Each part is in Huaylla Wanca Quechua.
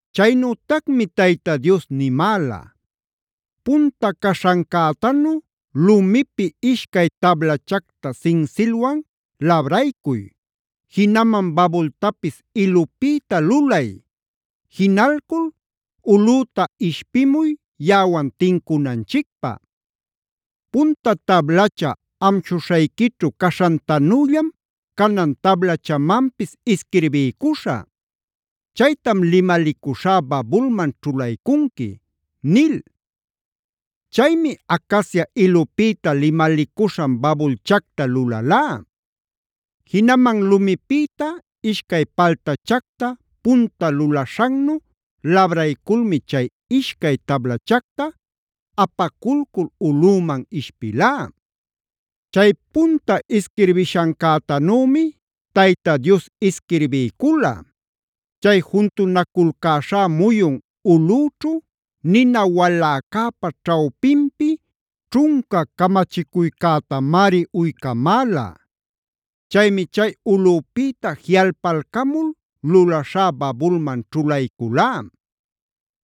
“Chaynütacmi Tayta Dios nimäla: ‘Punta caśhancätanu lumipi ishcay tablachacta sinsilwan labraycuy, jinaman babultapis ilupïta lulay; jinalcul ulꞌüta ishpimuy yaꞌawan tincunanchicpä. Punta tablacha amshuśhayquićhu caśhantanüllam canan tablachamanpis isquirbiycuśhä. Chaytam limalicuśhá babulman ćhulaycunqui’ nil. “Chaymi acacia ilupïta limalicuśhan babulchacta lulalá.a Jinaman lumipïta ishcay paltachacta punta lulaśhannu labrayculmi chay ishcay tablachacta apaculcul ulꞌüman ishpilá. Chay punta isquirbishancätanümi Tayta Dios isquirbiycula; chay juntunaculcäśhá muyun ulꞌüćhu nina waläcäpa ćhawpinpi ćhunca camachicuycätamari uycamäla. Chaymi chay ulꞌüpïta jiꞌalpalcamul lulaśhá babulman ćhulayculá.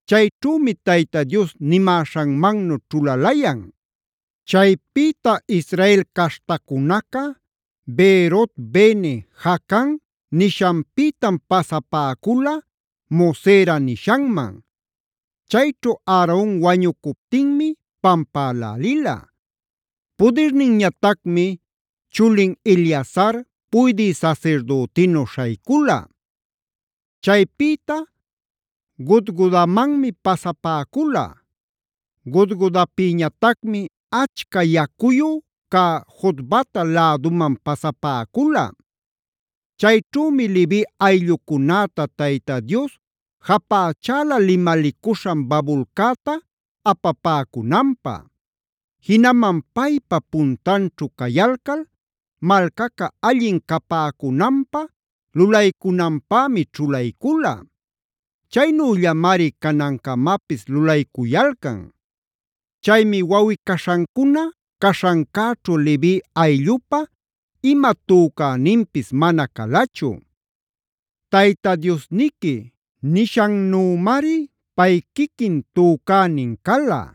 Chayćhümi Tayta Dios nimäśhanmannu ćhulalayan. “Chaypïta Israel caśhtacunaca Beerot-bene-jaacan nishanpïtam pasapäcula Mosera nishanman. Chayćhu Aaronb wañucuptinmi pampälälila. Pudirninñatacmi chulin Eleazar puydï sasirdütinu śhaycula. Chaypïta Gudgodamanmi pasapäcula; Gudgodapïñatacmi achca yacuyu cä Jotbata läduman pasapäcula. Chayćhümi Levi ayllucunätac Tayta Dios japächala limalicuśhan babulcäta apapäcunanpä. Jinaman paypa puntanćhu cayalcal malcaca allin capäcunanpä lulaycunanpämi ćhulaycula. Chaynüllamari canancamapis lulaycuyalcan. Chaymi wawꞌi-caśhancuna caśhancäćhu Levi ayllupa ima tücäninpis mana calachu. Tayta Diosniqui nishannümari pay quiquin tücänin cala.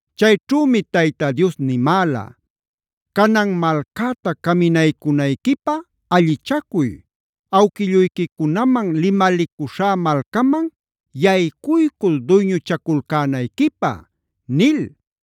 Chayćhümi Tayta Dios nimäla: ‘Canan malcäta caminaycunayquipä allichacuy; awquilluyquicunaman limalicuśhá malcaman yaycuycul duyñuchaculcänayquipä’ nil.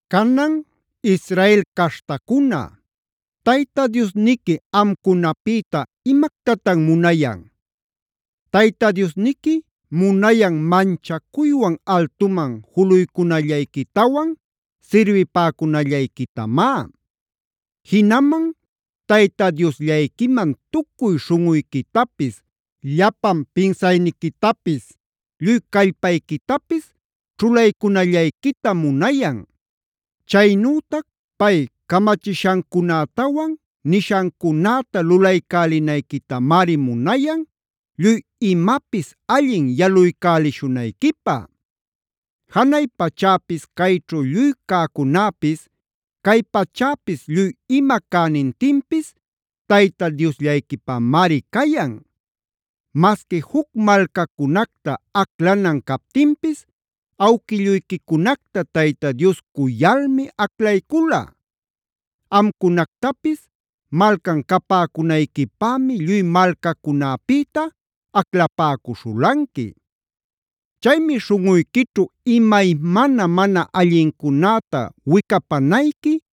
“Canan, Israel caśhtacuna, ¿Tayta Diosniqui amcunapïta imactatan munayan? Tayta Diosniqui munayan manchacuywan altuman juluycunallayquitawan sirbipäcunallayquitamá. Jinaman Tayta Diosllayquiman tucuy śhunꞌuyquitapis, llapan pinsayniquitapis, lluy callpayquitapis ćhulaycunallayquitam munayan. Chaynütac pay camachishancunätawan nishancunäta lulaycälinayquitamari munayan lluy imapis allin yaluycälishunayquipä. Janay pachäpis chayćhu lluy cäcunäpis, cay pachäpis lluy ima cänintinpis Tayta Diosllayquipamari cayan. Masqui juc malcacunacta aclanan captinpis awquilluyquicunacta Tayta Dios cuyalmi aclaycula. Amcunactapis malcan capäcunayquipämi lluy malcacunäpïta aclapäcuśhulanqui. “Chaymi śhunꞌuyquićhu imaymana mana allincunäta wicapanayqui,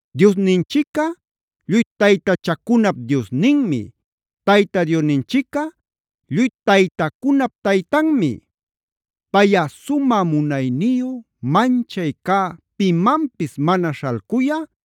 Dioninchicꞌa lluy taytachacunap Diosninmi,fg Tayta Diosninchicꞌa lluy taytacunap Taytanmi. Payꞌa sumä, munayniyu, manchay cä pimanpis mana śhalcuyä,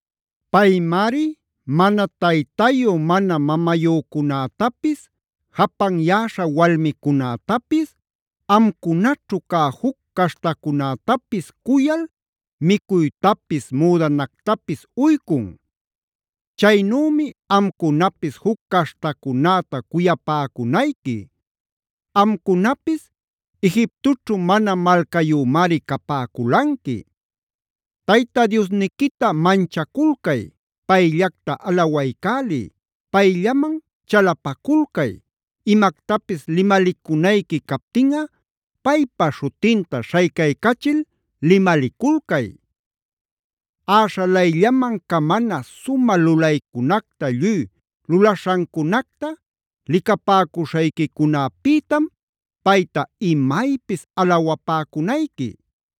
Paymari mana taytayu mana mamayücunätapis, japanyäśha walmicunätapis, amcunaćhu cä juc caśhtacunätapis cuyal micuytapis, müdanactapis uycun. Chaynümi amcunapis juc caśhtacunäta cuyapäcunayqui; amcunapis Egiptoćhu mana malcayümari capäculanqui. “Tayta Diosniquita manchaculcay, payllacta alawaycäliy, payllaman chalapaculcay, imactapis limalicunayqui captinꞌa paypa śhutinta śhaycaycachil limaliculcay. Äśhalayllaman camana sumä lulaycunacta lluy lulaśhancunacta licapäcuśhayquicunapïtam payta imaypis alawapäcunayqui.